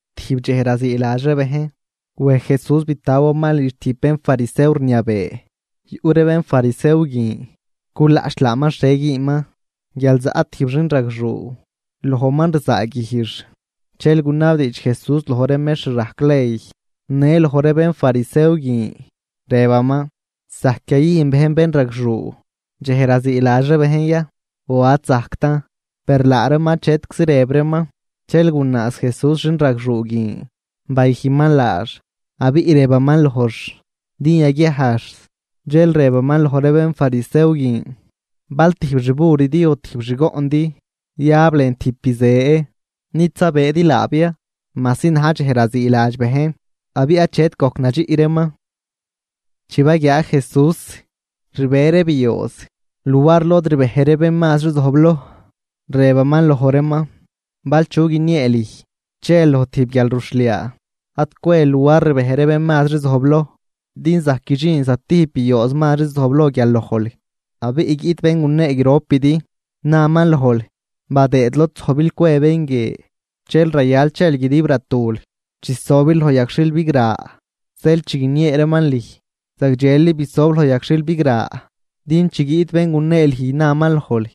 Tijb dxej raziiladx ree bejn wej Jesús bitawaman lidx tijb bénfarisew rniabee. Yuꞌ ree bénfarisew guin culaꞌch laaman xhie güünman, guial zaꞌ tijb xinragxuu lojman rzaaguijx. Dxel gunabdiidx Jesús loj ree mextr rajc ley në loj ree bénfarisew guin, rëbaman: ―¿Zajc yayüjn bejn bénragxuu dxej raziiladx ree bejn ya o ad zajctan? Per laa reeman achetczi rëb reeman. Dxel gunaaz Jesús xinragxuu guin bayüjnman laax, abiꞌ rëbaman lojx din yaguiajx. Dxel rëbaman loj ree bénfarisew guin: ―¿Bal tijb xburidi o tijb xgoꞌndi yab lën tijb bizë, nid zabëëdi laab ya, majsi na̱j dxej raziiladx bejn? Abiꞌ achet gojc nadxiꞌ reeman. Chi baguiaa Jesús rbe ree biooz luar lod rbej ree bén mazri zojbloj, rëbaman loj reeman: ―Bal chu guiniee lüj chel loj tijb guialruxhliaa, ad cwel luar rbej ree bén mazri zojbloj. Din zajc guidxin zatijb biooz mazri zojbloj guial lojl, abiꞌ guiꞌt bén gunee gropidi naman lojl: “Badëëd lod zojbil cwe bén guie.” Dxel rayal chel guidib ratul chisobil loj yagxhil bigra. Zeel chi guiniee reeman lüj, zagdxeli bisob loj yagxhil bigra, din chi guiꞌt bén gunee lüj naman lojl: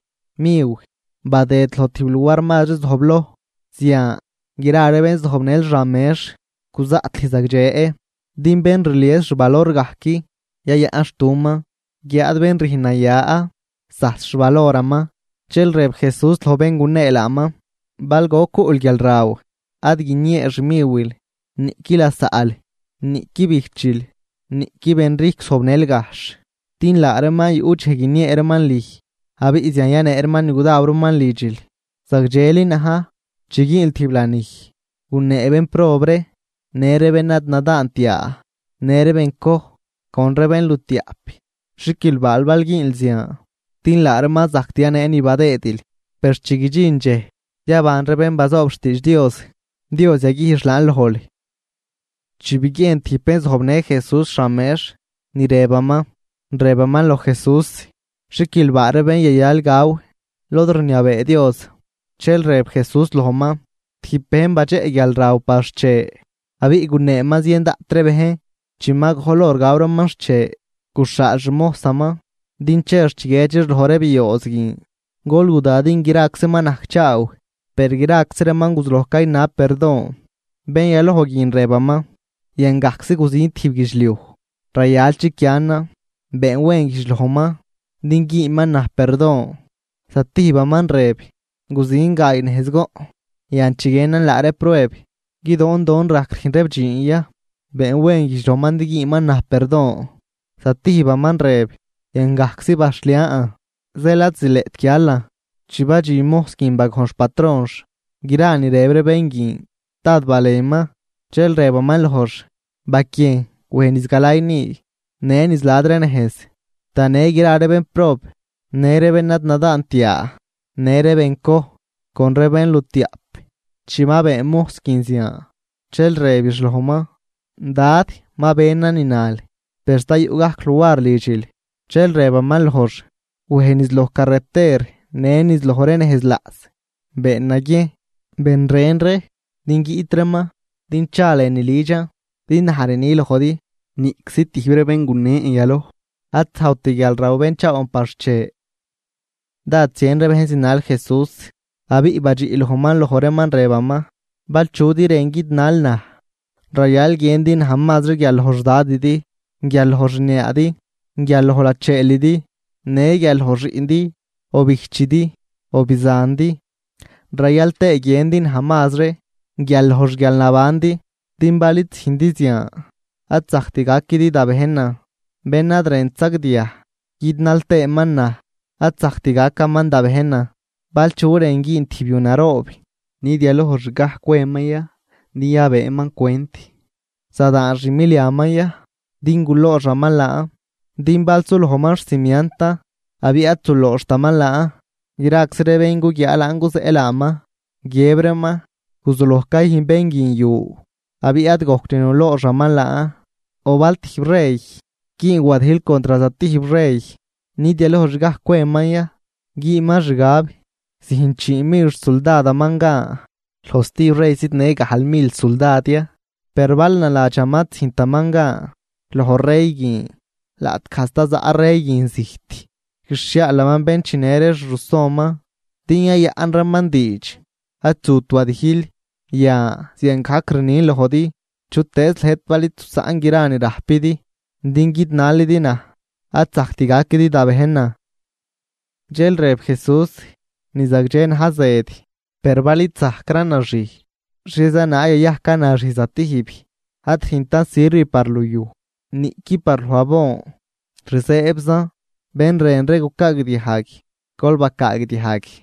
“Miw, badëd loj tijb luar mazri zojbloj.” Zian, gra ree bén zojbnël xan mex guzaꞌt lüj zagdxe. Din bén rlies xvalor gajc, yayaꞌnxtuman. Guiáad bén rüjn naya zajs xvaloraman. Dxel rëb Jesús loj bén gunee laaman: ―Bal goc cuꞌl guialraw, ad guiniee xmiwil, niꞌqui lasaꞌl, niꞌqui bijchil, niꞌqui benrijcw zojbnël gajxh. Din laa reeman yuꞌ dxej guiniee reeman lüj, abiꞌ zian yanee reeman ni gudaw reeman lidxil. Zagdxeli na̱j, chi güünl tijb lanij, gunee bénprob ree, në ree bén ad nadaant yaa, në ree bencoj con ree bénlutiaꞌp. Xiquilbaal bal güünl zian, din laa reeman ad zajct yanee ni badëëdil. Per chi guidxin dxej yaban ree bén bazoob xtiidx Dios, Dios yaguijx laan lojl. Chi biguiejn tijb bén zojbnë Jesús xan mex ni rëbaman, rëbaman loj Jesús: ―¡Xiquilbaa ree bén yayal gaw lod rniabee Dios! Dxel rëb Jesús lojman: ―Tijb bejn badxeꞌ guialraw par xche, abiꞌ guneeman zien daꞌt ree bejn. Chi ma gojl hor gaw reeman xche, guxhaal xmojsaman din chex chiguiedxix loj ree biooz guin: “Gol guda din graczi ma najcchaaw.” Per graczi reeman guzuloj caynab perdon. Bén yaloj guin, rëbaman: “Yan gajczi guzin tijb guidxliuj, rayal chiquianan; been wen güjdx lojman din güünman naj perdon.” Zatijbaman rëb: “Guzin gaay nejz goꞌn, yan chiguienan laa reeb prueb guidoondon rajc rüjn reeb dxiin ya; been wen güjdx lojman din güünman naj perdon.” Zatijbaman rëb: “Yan gajczi baxhlian zeel ad zileꞌt guialan.” Chi badxin mojs guin bagojn xpatronx gra ni rëb ree bén guin, dád balenman, dxel rëbaman lojx: “Baquiejn wej niz galay ni, në niz la̱d ree nejz, tanë gra ree bénprob në ree bén ad nadaant yaa, në ree bencoj con ree bénlutiaꞌp.” Chi ma been mojs guin zian, dxel rëbix lojman: “Dad, ma benan ni nal, per sta yuꞌ gajc luar lidxil.” Dxel rëbaman lojx: “Wej niz loj carreter në niz loj ree nejz laꞌs, been naguiejn ben ren ree din guiꞌt reeman din cha lënü lidxan. Din naj rni lojdi, niꞌczi tijb ree bén gunen yaloj ad zajwt guialraw benchaawan par xche.” Dád zien ree bejn zinal Jesús; abiꞌ badxiꞌ lojman loj reeman rëbaman: ―Bal chudi rën guidnal naj, rayal guiëndi naj mazri guial loj xdadidi, guial loj xniaadi, guial loj lacheelidi, në guial loj xiꞌndi, o bijchidi o bizandi, rayal tëë guiëndi naj mazri guial loj xguialnabandi, din bal id züjndi zian ad zajct gaquidi da bejnan. Bén ad rënt sagdiaj guidnal tëëman naj, ad zajct gacaman da bejnan. ’Bal chu rën güün tijb yu naroob, ¿nid yalojxgaj cweman ya din cwëëman cwent zadaan xmiliaman ya din gulooxaman laan? Din bal sulojman xcimiantan abiꞌ ad zulooxtaman laan, graczi ree bén guguiaa laan guzeꞌ laaman, guiëb reeman: “Guzuloj cayüjn bén guin yu abiꞌ ad gojct nulooxaman laan.” ’O bal tijb rey güün wadijl contr zatijb rey, ¿nid yalojxgaj cweman ya güünman xgab züjn chii mil xsuldadaman gan loj stijb rey zidnë gajl mil suldad ya? Per bal naladxaman ad züjntaman gan loj rey guin, laꞌtgaj sta zaꞌ rey guin zijt, guixhiaalaman bén chinë ree xrusonman din yayaꞌn reeman diidx ad zut wadijl. Yan, ziangajc rnin lojdi, chutëëz lëjt bal id zusaꞌn gra ni rajpidi din guidnalidi naj, ad zajct gaquidi da bejnan. Dxel rëb Jesús: ―Ni zagdxe na̱j zëd. Per bal id zajcran naxij, ¿xhieza naag yayajcan naxij zatijb? Ad rüjntan sirv par luyuj niꞌqui par loj abon, rzëëbzan. ¡Bén rën ree gucaagdiajg, gol bacaagdiajg!